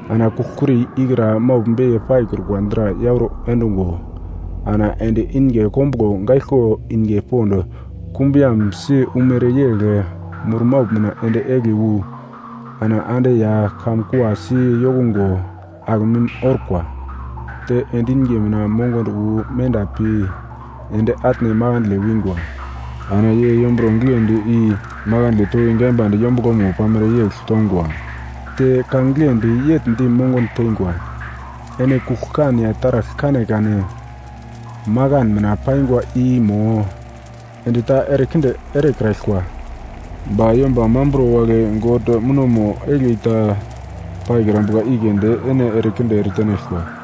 Ana kugl-kuri ikra maugl beiye paikrukwa dra yauro endungo ana ende inge kombuglo gaiglko inge pond kumbuyambsi umere yegl murmaugl mina ende egli wu ana ande ya kamun kua si yokungo akemim orkwa. Te endi inge mina mongondo wu menda pi ende atne makandle wingwa. Ana ye yomburo giglendi, i makandle toki gaimbande yombuglomo pamere yegl tongwa. Te ka giglendi yegl di mongondo tengwa, “Ene kugl-kan ya taragl kanekane makan mina paingwa i mo endi ta erekinde erekraglkwa. Ba yomba mamburo wagle God munomo egli ta paikrambuka i keunde ene erekinde eretenaglkwa.”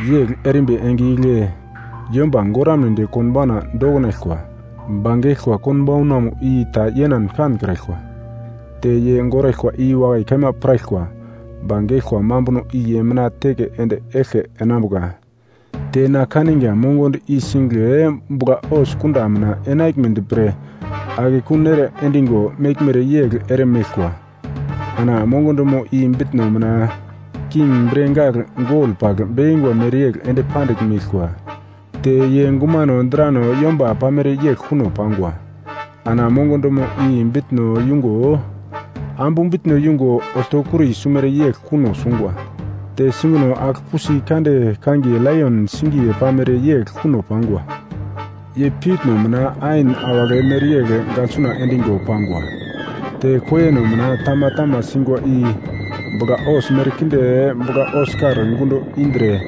Yegl erimbi enge igle yomba goramnedi konbauna dokinaglkwa, ba geglkwa konbaunamo i ta yenan kankraglkwa. Te ye goraglkwa i wakai kaima piraglkwa, ba geglkwa mambuno i ye mina teke ende eglke enambuka. Te na kaniga mongondo i singigle bugla-hos kunda mina enaglmedi pre akekun ere endigo meglmere yegl ere meglkwa. Ana mongondomo i bitno mina king bre gagl gol pagl bekingwa mereyegl ende pandigl meglkwa. Te ye gumano drano yomba pamere yegl kuno pangwa. Ana mongondomo i bitno yungo ambu bitno yungo oltokuri sumere yegl kuno sungwa. Te singino agl-pusi kande kangiye laion singiye pamere yegl kuno pangwa. Ye piutno mina ain awagle mereyegl gaglsuna endigo pangwa. Te koiyeno mina tama tama singwa i bugla-hos merkinde bugla-hos-kar gundo indre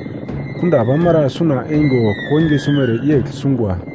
kunda pamara suna eingo koinge sumere yegl sungwa.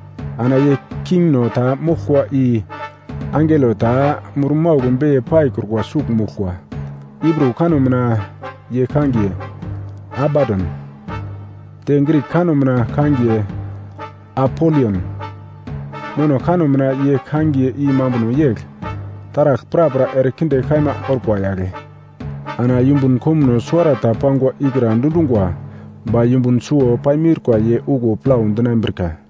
Ana ye kingno ta moglkwa i angelo ta murmaugl beiye paikrukwa sugl moglkwa. Hibru kanno mina ye kangiye “Abadon,” te Grik kanno mina kangiye “Apolion,” nono kanno mina ye kangiye i mambunomo yegl, “Taragl prapra erekinde kaima orkwa yagle.” Ana yumbun komuno suwarata pangwa ikra dundungwa, ba yumbun suwo paimiurka ye okuwo plau dinambrika.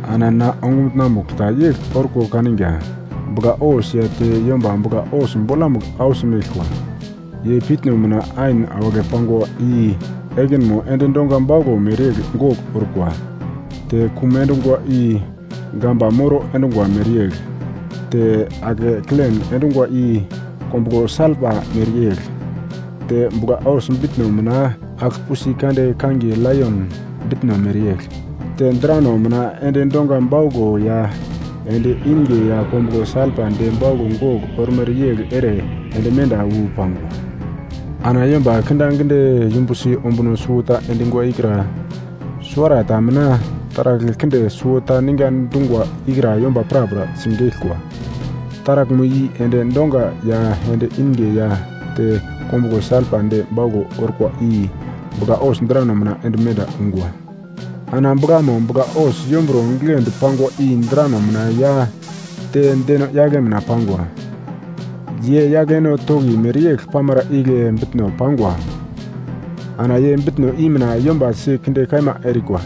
Ana na ongumutna-mugl ta yegl orko kaniga, bugla-hos ya te yomba bugla-hos bolamugl ausi meglkwa. Ye piutno mina ain awagle pangwa i ekinmo endi dongwa bauglo mereyegl gogl orkwa, te kum endungwa, i gamba moro endungwa mereyegl, te ake kilen endungwa i kombuglo salpa mereyegl. Te bugla-hos bitno mina agl-pusi kande kangiye laion bitno mereyegl, te drano mina endi dongwa bauglo ya endi inge ya kombuglo salpa de bauglo gogl ormere yegl ere ende menda wu pangwa. Ana yomba kindaginde yumbusi ombuno suwota endingwa ikra suwarata mina taragl kinde suwota ninga dungwa ikra yomba prapra sigeglkwa. Taraglmo i endi dongwa ya endi inge ya te kombuglo salpa de bauglo orkwa i bugla-hos drano mina ende menda ungwa. Ana buglamo bugla-hos yomburo giglendi pangwa i drano mina ya te deno-yagle mina pangwa. Ye yagleno toki mereyegl pamara igle bitno pangwa. Ana ye bitno i mina yomba si kinde kaima erikwa.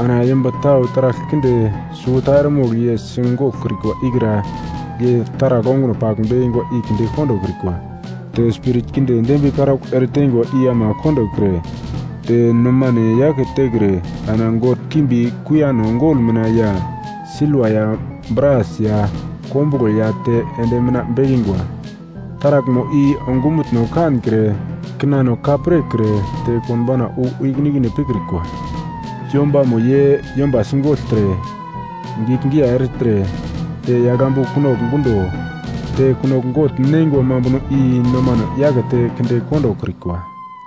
Ana yomba tau taragl kinde suwota eremogl ye sigoglkrikwa ikra ye taragl onguno pagl bekingwa i kinde kondokrikwa. Te spirit kinde dembiye karaugl eretengwa i ama kondokre te nomane yake tekre ana god kimbi kuiyano gol mina ya silva ya bras ya kombuglo ya te endi mina bekingwa. Taraglmo i ongumutno kankre, kinano ka pirkre te konbauna wu ikine-ikine pikrikwa. Yombamo ye yomba sigogltre, giglgiyai ertre te yagl ambu kunogl gundo te kunogl gogl neingwa mambuno i nomane yakete kinde kondokrikwa.